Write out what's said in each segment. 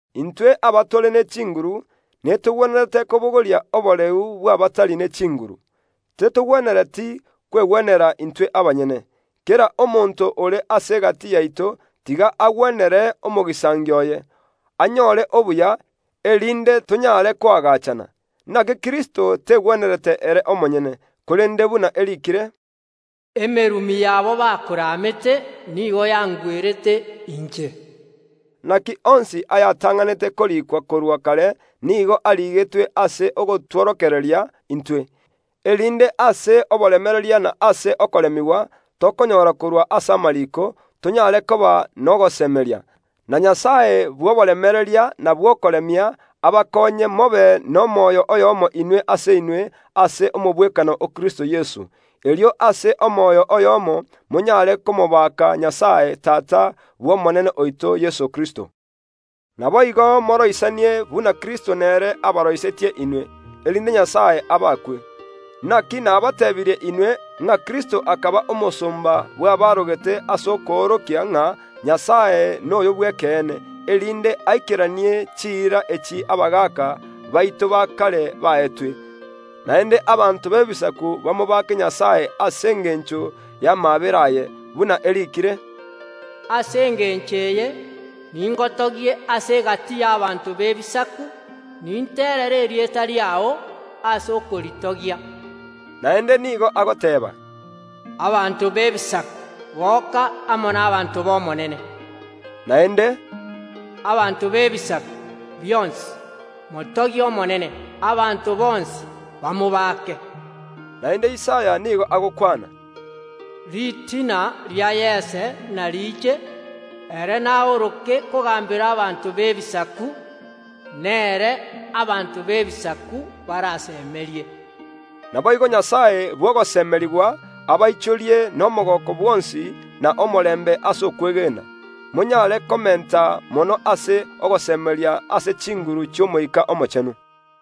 Intwe abatore ne chinguru netogwenerete kobogoria oboreu bw’abatari ne chinguru, tetogwenereti kwegwenera intwe abanyene. Kera omonto ore ase egati yaito tiga agwenere omogisangio oye, anyore obuya, erinde tonyare koagachana, Inaki Kristo tegwenerete ere omonyene; korende buna eriikire, “Emerumi yabo bakoramete nigo yangwerete inche.” Inaki onsi ayatang’anete koriikwa korwa kare nigo arigetwe ase ogotworokereria intwe, erinde ase oboremereria na ase okoremigwa tokonyora korwa ase amariiko, tonyare koba nogosemeria. Na Nyasae bw’oboremereria na bw’okoremia abakoonye mobe n’omoyo oyomo inwe ase inwe ase omogwekano o Kristo Yeso; erio ase omoyo oyomo monyare komobaka Nyasae Tata n’Omonene oito Yeso Kristo. Naboigo moroisanie buna Kristo nere abaroisetie inwe, erinde Nyasae abaakwe. Inaki nabateebirie inwe, ng’a Kristo akaba omosomba bw’abaarogete ase okoorokia ng’a Nyasae noyo bw’ekeene, erinde aikeranie chiira echi abagaaka baito ba kare baetwe. Naende abanto b’Ebisaku bamobake Nyasae ase engencho y’amaabera aye, buna eriikire, “Ase engencho eye ningotogie ase egati y’ abanto b’Ebisaku, ninterere erieta riao ase okoritogia.” Naende nigo agoteeba, “Abanto b’Ebisaku, goka amo n’abanto ba n’Omonene.” Naende, “Abanto b’Ebisaku bionsi, motogie Omonene; abanto bonsi bamobaake!” Naende Isaya nigo agokwana, “Ritina ria Yese inariiche, ere naoroke kogaambera abanto b’Ebisaku; nere abanto b’Ebisaku barasemerie.” Naboigo Nyasae bw’ogosemerigwa abaichorie n’omogooko bwonsi na omorembe ase okwegena, monyare komenta mono ase ogosemeria ase chinguru chi’Omoika Omochenu.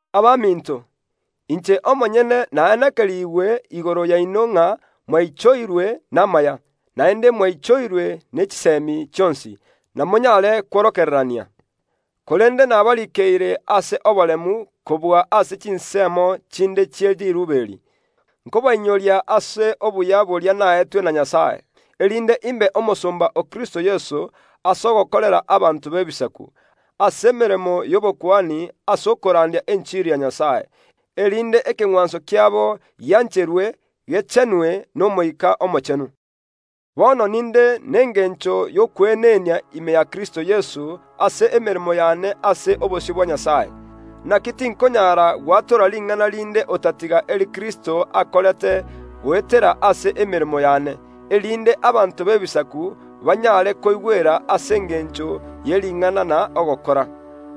Abaminto, inche omonyene naenekerigwe igoro yaino ng’a mwaichoirwe n’amaya, naende mwaichoirwe ne chisemi chionsi, na monyare kworokererania. Korende nabariikeire ase oboremu kobua ase chinsemo chinde chie riirube eri, nkobainyoria ase obuya boria naetwe na Nyasae, erinde imbe omosomba o Kristo Yeso ase ogokorera abanto b’Ebisaku, emeremo y’obokuani ase okorandia enchiri ya Nyasae, erinde ekeng’wanso kiabo giancherwe, gechenwe n’Omoika Omochenu. Bono ninde n’engencho y’okweenenia ime ya Kristo Yeso ase emeremo y’ane ase obosio bwa Nyasae. Inaki tinkonyara gwatora ring’ana rinde otatiga eri Kristo akorete goetera ase emeremo y’ane, erinde abanto b’Ebisaku banyare koigwera ase engencho ye ring’ana na ogokora,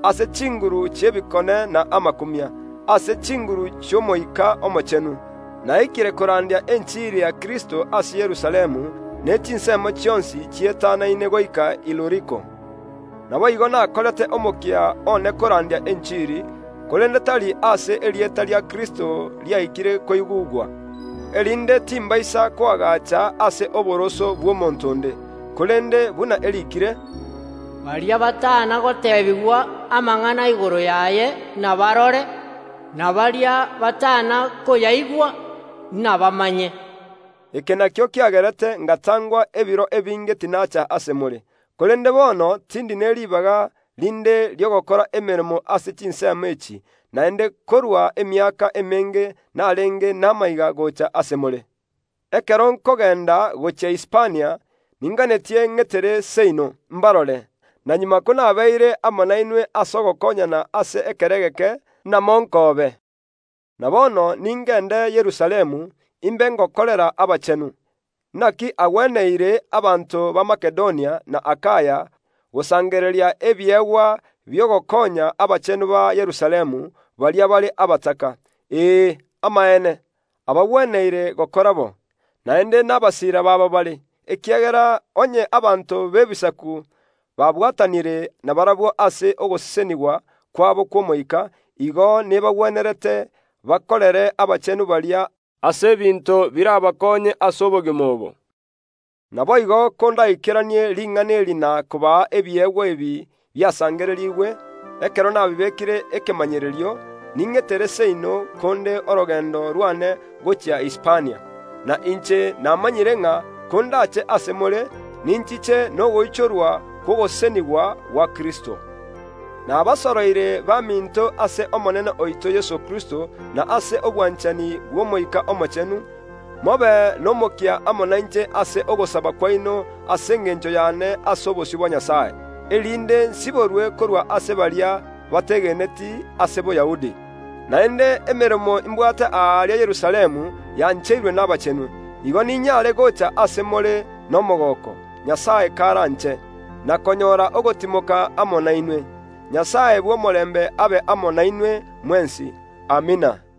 ase chinguru chi’ebikone na amakumia, ase chinguru chi’Omoika Omochenu. Naikire korandia enchiri ya Kristo ase Yerusalemu ne chinsemo chionsi chietanaine goika Iluriko. Naboigo nakorete omokia one korandia enchiri, korende tari aase erieta ria Kristo riaikire koigugwa, erinde timbaisa koagacha ase oboroso bw’omonto onde, korende, buna eriikire, “Baria batana goteebigwa amang’ana igoro yaye, inabarore, na baria batana koyaigwa, inabamanye.” Eke nakio kiagerete ingatangwa ebiro ebinge tinaacha ase more. Korende bono tindi ne ribaga rinde ri’ogokora emeremo ase chinsemo echi, naende korwa emiaka emenge inarenge namaiga gocha ase more. Ekero nkogenda gochia Hispania ninganetie ng’etere seino, ’mbarore. Na magega konabeire amo nainwe ase ogokonyana ase ekero egeke, namonkoobe. Na bono ningende Yerusalemu, imbe ingokorera abachenu. Inaki agweneire abanto ba Makedonia na Akaya gosangereria ebiegwa bi’ogokonya abachenu ba Yerusalemu, baria bare abataka. Ee, amaene, abagweneire gokora bo, naende nabasiira babo bare, ekiagera onye abanto b’Ebisaku babwatanire nabarabwo ase ogosesenigwa kwabo kw’omoika, igo nebagwenerete bakorere abachenu baria ase ebinto birabakonye ase obogima obo. Naboigo kondaikeranie ring’ana eri na kobaa ebiegwa ebi biasangererigwe, ekero nabibekire ekemanyererio, ning’etere seino konde orogendo rw’ane gochia Hispania. Na inche namanyire ng’a kondache ase more, ninchiche nogoichorwa kw’ogosesenigwa gwa Kristo. Nabasoroire baminto ase Omonene oito Yeso Kristo na ase obwanchani bw’Omoika Omochenu, mobe n’omokia amo nainche ase ogosaba kwaino ase engencho y’ane ase obosio bwa Nyasae; erinde nsiborwe korwa ase baria bategeneti ase Boyahudi, naende emeremo imbwate aaria Yerusalemu yancheirwe n’abachenu. Igo niny’are gocha ase more n’omogooko, Nyasae karanche, na konyora ogotimoka amo nainwe. Nyasae bw’omorembe abe amo nainwe mwensi. Amina.